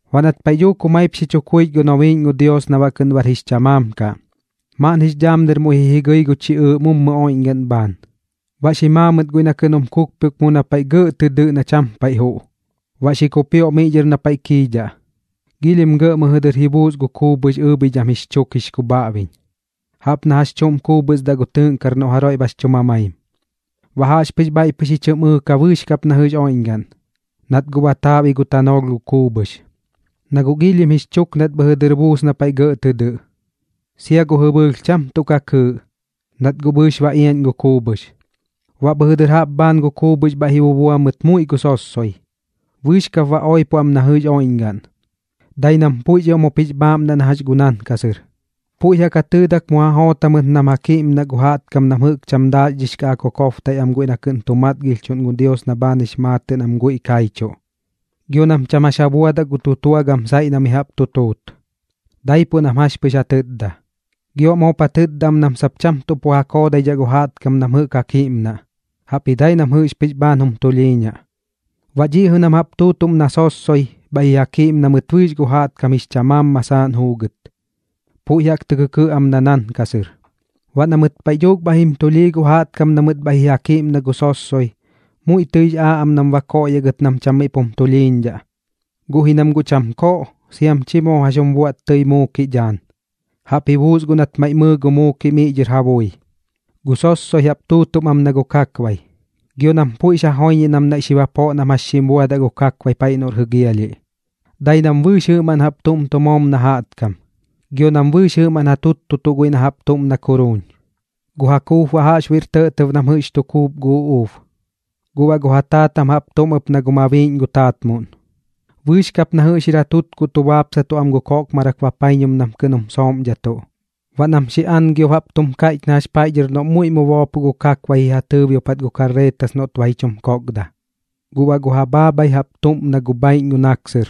Baꞌ nat paiꞌ dhuuk jumaip xi chu kuich gu nobiiꞌñ gu Dios na baꞌ kɨꞌn bar jix chamaam kaꞌ, maaꞌn jix dhaam dɨr muiꞌ ji jigɨi gu chiꞌɨɨꞌ mummu oiꞌñgaꞌn bhaan, baꞌ xi maa mɨt guiꞌ na kɨꞌn jum kukpioꞌk mu na paiꞌ gɇꞌ tɨ dɨꞌ na cham paiꞌ juꞌ. Baꞌ xi kupioꞌ miꞌ dhɨr na paiꞌ kiidhaꞌ, giilhim gɇꞌ mɨjɨ dɨr ji buus gu kuubhɨx ɨɨbhidham jix chuk jix kubhaꞌbiñ, jaꞌp na jax chuꞌm kuubhɨsdaꞌ gu tɨɨꞌnkar noꞌ jaroiꞌ bax chu mamaim. Baꞌ jaꞌxpɨx bhaiꞌ pɨx ji chɨm ɨɨka bɨɨx kap na jɨꞌx oiꞌñgaꞌn, nat guꞌ ba taaꞌbi gu tanoolh gu kuubhɨx, na guꞌ giilhim jix chuk nat mɨjɨ dɨr buus na paiꞌ gɇꞌ tɨ dɨꞌ. Sia gu jɨbɨɨlh cham tuꞌ ka kɨɨꞌ, nat guꞌ bɨɨx ba iaꞌñ gu kuubhɨx. Baꞌ bhɨjɨ dɨr jaꞌp bhaan gu kuubhɨx bhaiꞌ ji bubua mɨt muiꞌ gu sossoi, bɨɨx kap ba oipo am na jɨꞌx oiꞌñgaꞌn, dai nam puiꞌx ioꞌm jup jix bhaaꞌmnaꞌ na jax gu nankasɨr. Puiꞌ jaꞌk ja tɨɨdak mu ja joot jamɨt nam ja kiꞌmnaꞌ gu jaꞌtkam na jɨꞌk cham daaxdhix kaꞌ ja kokobtaiꞌ am guiꞌ na kɨꞌn tu matgilhchuꞌn gu Dios na bhaan jix maatɨꞌ nam guiꞌ kaichuꞌ, gio nam cham jax ja buadaꞌ gu tutua gam saiꞌ na mi jaꞌp tu tuut, daipuꞌ nam jax pɨx ja tɨtda. Gio baꞌ moop ja tɨtda am ɨp nam sap cham tuꞌ pu ja koodaidhaꞌ gu jaꞌtkam nam jɨꞌk ja kiꞌmnaꞌ, jaꞌpji dai nam jɨꞌx pɨx bhaan jum tulhiiñaꞌ. Baꞌ dhiꞌ jɨꞌ nam jaꞌp tuutuꞌm na sossoi, bhaiꞌ ji ja kiꞌmna mɨt bɨɨx gu jaꞌtkam jix chamaam masaaꞌn juugɨt, puiꞌ jaꞌk tɨ kɨkɨꞌ am na nankasɨr. Baꞌ na mɨt paiꞌ dhuuk bhaiꞌ jim tulhii gu jaꞌtkam na mɨt bhaiꞌ ji ja kiꞌmna gu sossoi, muiꞌ tɨix aaꞌ am nam ba koꞌyaꞌ gɨt nam cham miꞌ pum tulhiiñdhaꞌ, guꞌ ji nam guꞌ cham koꞌ siam chi moo jax jum buaꞌt tɨi muukiꞌ dhaan, jaꞌp ji buus guꞌ nat maiꞌ mɨɨ gu muukiꞌ miꞌ dhɨr ja bui. Gu sossoi jaꞌp tuutuꞌm am na gu kakbai, gio nam puiꞌx ja joiñiꞌ nam naiꞌ xi bapoꞌ nam jax xim buadaꞌ gu kakbai paiꞌ noꞌr jɨgialhiꞌ. Dai nam bɨɨx jɨꞌmaꞌn jaꞌp tuꞌm tu moom na jaꞌtkam, gio nam bɨɨx jɨꞌmaꞌn ja tuttutuꞌ guiꞌ na jaꞌp tuꞌm na kuruun. Gu ja kuup baꞌ jaꞌxbuiꞌr tɇꞌtɇb nam jɨꞌx tu kuup gu uꞌuub, guꞌ baꞌ gu ja taatam jaꞌp tuꞌm ɨp na gu mabiiꞌñ gu taatmuꞌn. Bɨɨx kap na jɨꞌx jir ja tutkuꞌ tu baapsatuꞌ am gu koꞌkmarak bapaiñum nam kɨꞌn jum sooꞌmdhatuꞌ. Baꞌ nam xi aꞌngɨb jaꞌp tum kaiꞌch na jax noꞌm paiꞌ dhɨr muiꞌ mu boopoꞌ gu kakbai ji ja tɨɨbiopat gu kakret noꞌt ba ji chum kokda. Guꞌ baꞌ gu ja bhaabhai jaꞌp tuꞌm na gu bhaiꞌñ gu naksɨr,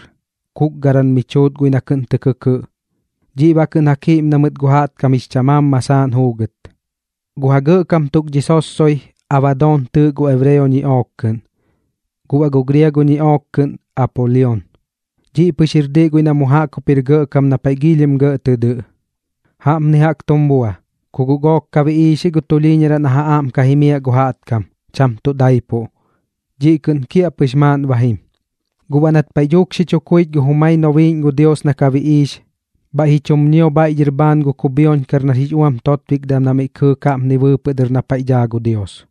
kukgaram mi chuut guiꞌ na kɨꞌn tɨ kɨkɨꞌ. Dhiꞌ baꞌ kɨꞌn ja kiꞌmna mɨt gu jaꞌtkam jix chamaam masaaꞌn juugɨt. Gu ja gɇꞌkam tuk dhi sossoi, Abadoon tɨɨꞌ gu ebreo ñiꞌook kɨꞌn, guꞌ baꞌ gu griago ñiꞌook kɨꞌn Apolion. Dhiꞌ pɨx jir diꞌ guiꞌ na mu jaꞌk jup jir gɇꞌkam na paiꞌ giilhim gɇꞌ tɨ dɨꞌ. Jaꞌpni jaꞌk tum bua, ku guꞌ gook ka biꞌiix ji gu tulhiiñaraꞌ na ja aꞌm ka jimiaꞌ gu jaꞌtkam, cham tuꞌ daipuꞌ. Dhiꞌ kɨꞌn kiaꞌpɨx maaꞌn ba jim. Guꞌ baꞌ nat paiꞌ dhuuk xi chu kuich gu jumai nobiiꞌñ gu Dios na ka biꞌiix, bhaiꞌ ji chum ñio bhaiꞌ dhɨr bhaan gu kubhioñkar nar jix uam totbikdam na miꞌ kɨɨk jaꞌpni bɨɨpɨꞌ dɨr na paiꞌ daa gu Dios,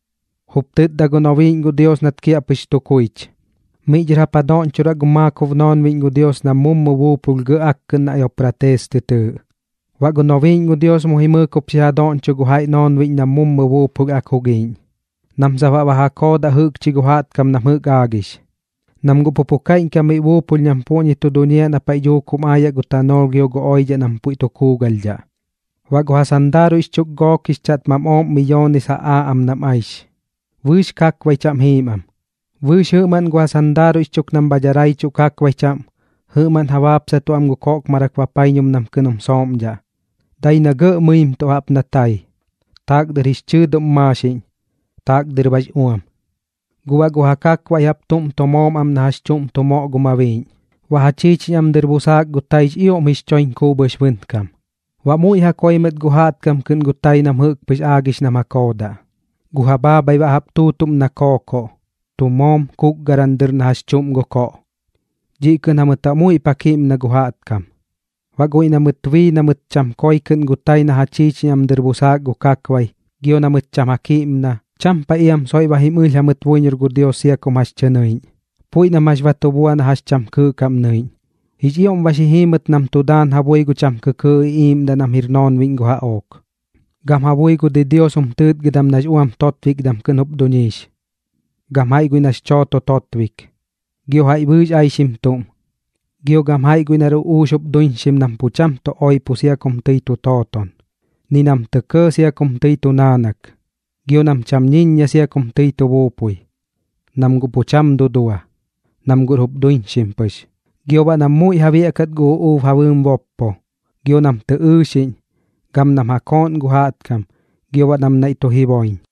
jup tɨtda gu nobiiꞌñ gu Dios nat kiaꞌpɨx tu kuich: ―Miꞌ dhɨr jap ja doꞌñchoraꞌ gu maakob noonbiꞌñ gu Dios nam mummu buupulh gɇꞌ akkɨꞌn na Eupraates tɨ tɨɨꞌ. Baꞌ gu nobiiꞌñ gu Dios mu jimɨɨk jup xi ja doꞌñcho gu jaiꞌ noonbiꞌñ nam mummu buupulh ak jugiiꞌñ, nam sap baꞌ ba ja koodaꞌ jɨꞌkchi gu jaꞌtkam na jɨꞌk aagix, nam guꞌ pu pu kaiꞌñkam miꞌ buupulh nam puꞌñi tu duñiaꞌ na paiꞌ dhuuk jum aayaꞌ gu tanoolh gio gu oidhaꞌ na puiꞌ tu kuugalhdhaꞌ. Baꞌ gu ja sandaaruiꞌx chuk gook jix chaꞌtmam ooꞌm miyoones ja aa am nam aix, bɨɨx kakbai chaꞌm jiim am. Bɨɨx jɨꞌmaꞌn gu ja sandaaruiꞌx chuk nam bha daraichuꞌ kakbai chaꞌm, jɨꞌmaꞌn ja baapsatuꞌ am gu koꞌkmarak bapaiñum nam kɨꞌn jum sooꞌmdhaꞌ, dai na gɇꞌ mɨimtuꞌ jaꞌp na tai, taak dɨr jix chɨɨduꞌm maaxiꞌñ, taak dɨr baꞌx uam. Guꞌ baꞌ gu ja kakbaiꞌ jaꞌp tuꞌm tu moom am na jax chuꞌm tu moꞌ gu mabiiꞌñ, baꞌ ja chiichiñ am dɨr busaak gu taix ioꞌm jix choiñ kuubhɨx bɨnkam. Baꞌ muiꞌ ja koi mɨt gu jaꞌtkam kɨꞌn gu tai nam jɨꞌk pɨx aagix nam ja koodaꞌ. Gu ja bhaabhai baꞌ jaꞌp tuutuꞌm na kookoꞌ, tu moom kukgaram dɨr na jax chuꞌm gu koꞌ. Dhiꞌ kɨꞌn jamɨt baꞌ muiꞌp ja kiꞌmna gu jaꞌtkam. Baꞌ guiꞌ na mɨt bii na mɨt cham koi kɨꞌn gu tai na ja chiichiñ am dɨr busaak gu kakbai, gio na mɨt cham ja kiꞌmna, cham paiꞌ iam soiꞌ ba jim ɨlh jamɨt buiñor gu Dios sia kum jax tɨ nɨiꞌñ, puiꞌ nam jax ba tu bua na jax cham kɨɨꞌ kaꞌm nɨiꞌñ. Jix ioꞌm ba xi jii mɨt nam tu daan ja bui gu cham kɨkɨɨꞌ iꞌiiꞌmdaꞌ nam jir noonbiꞌñ gu jaꞌook, gam ja bui gu didios jum tɨɨtgɨdam nax uam totbikdam kɨꞌn jup duñiix, gam jaiꞌ guiꞌ nax chooto totbik, gio jaiꞌ bɨɨx aixim tuꞌm, gio gam jaiꞌ guiꞌ nar uꞌuux jup duiñxim nam pu cham tu oipo sia kum tɨi tu tooton, ni nam tɇ kɇɇ sia kum tɨi tu naanak, gio nam cham ñiññia sia kum tɨi tu buupui, nam guꞌ pu cham tuꞌ dudua, nam guꞌr jup duñiixim pɨx. Gio baꞌ nam muiꞌ ja biaꞌkat gu uꞌuub ja bɨɨm boppo, gio nam tɨ ɨɨxiꞌñ, gam nam ja kooꞌn gu jaꞌtkam, gio baꞌ nam naiꞌ tu jiboiñ.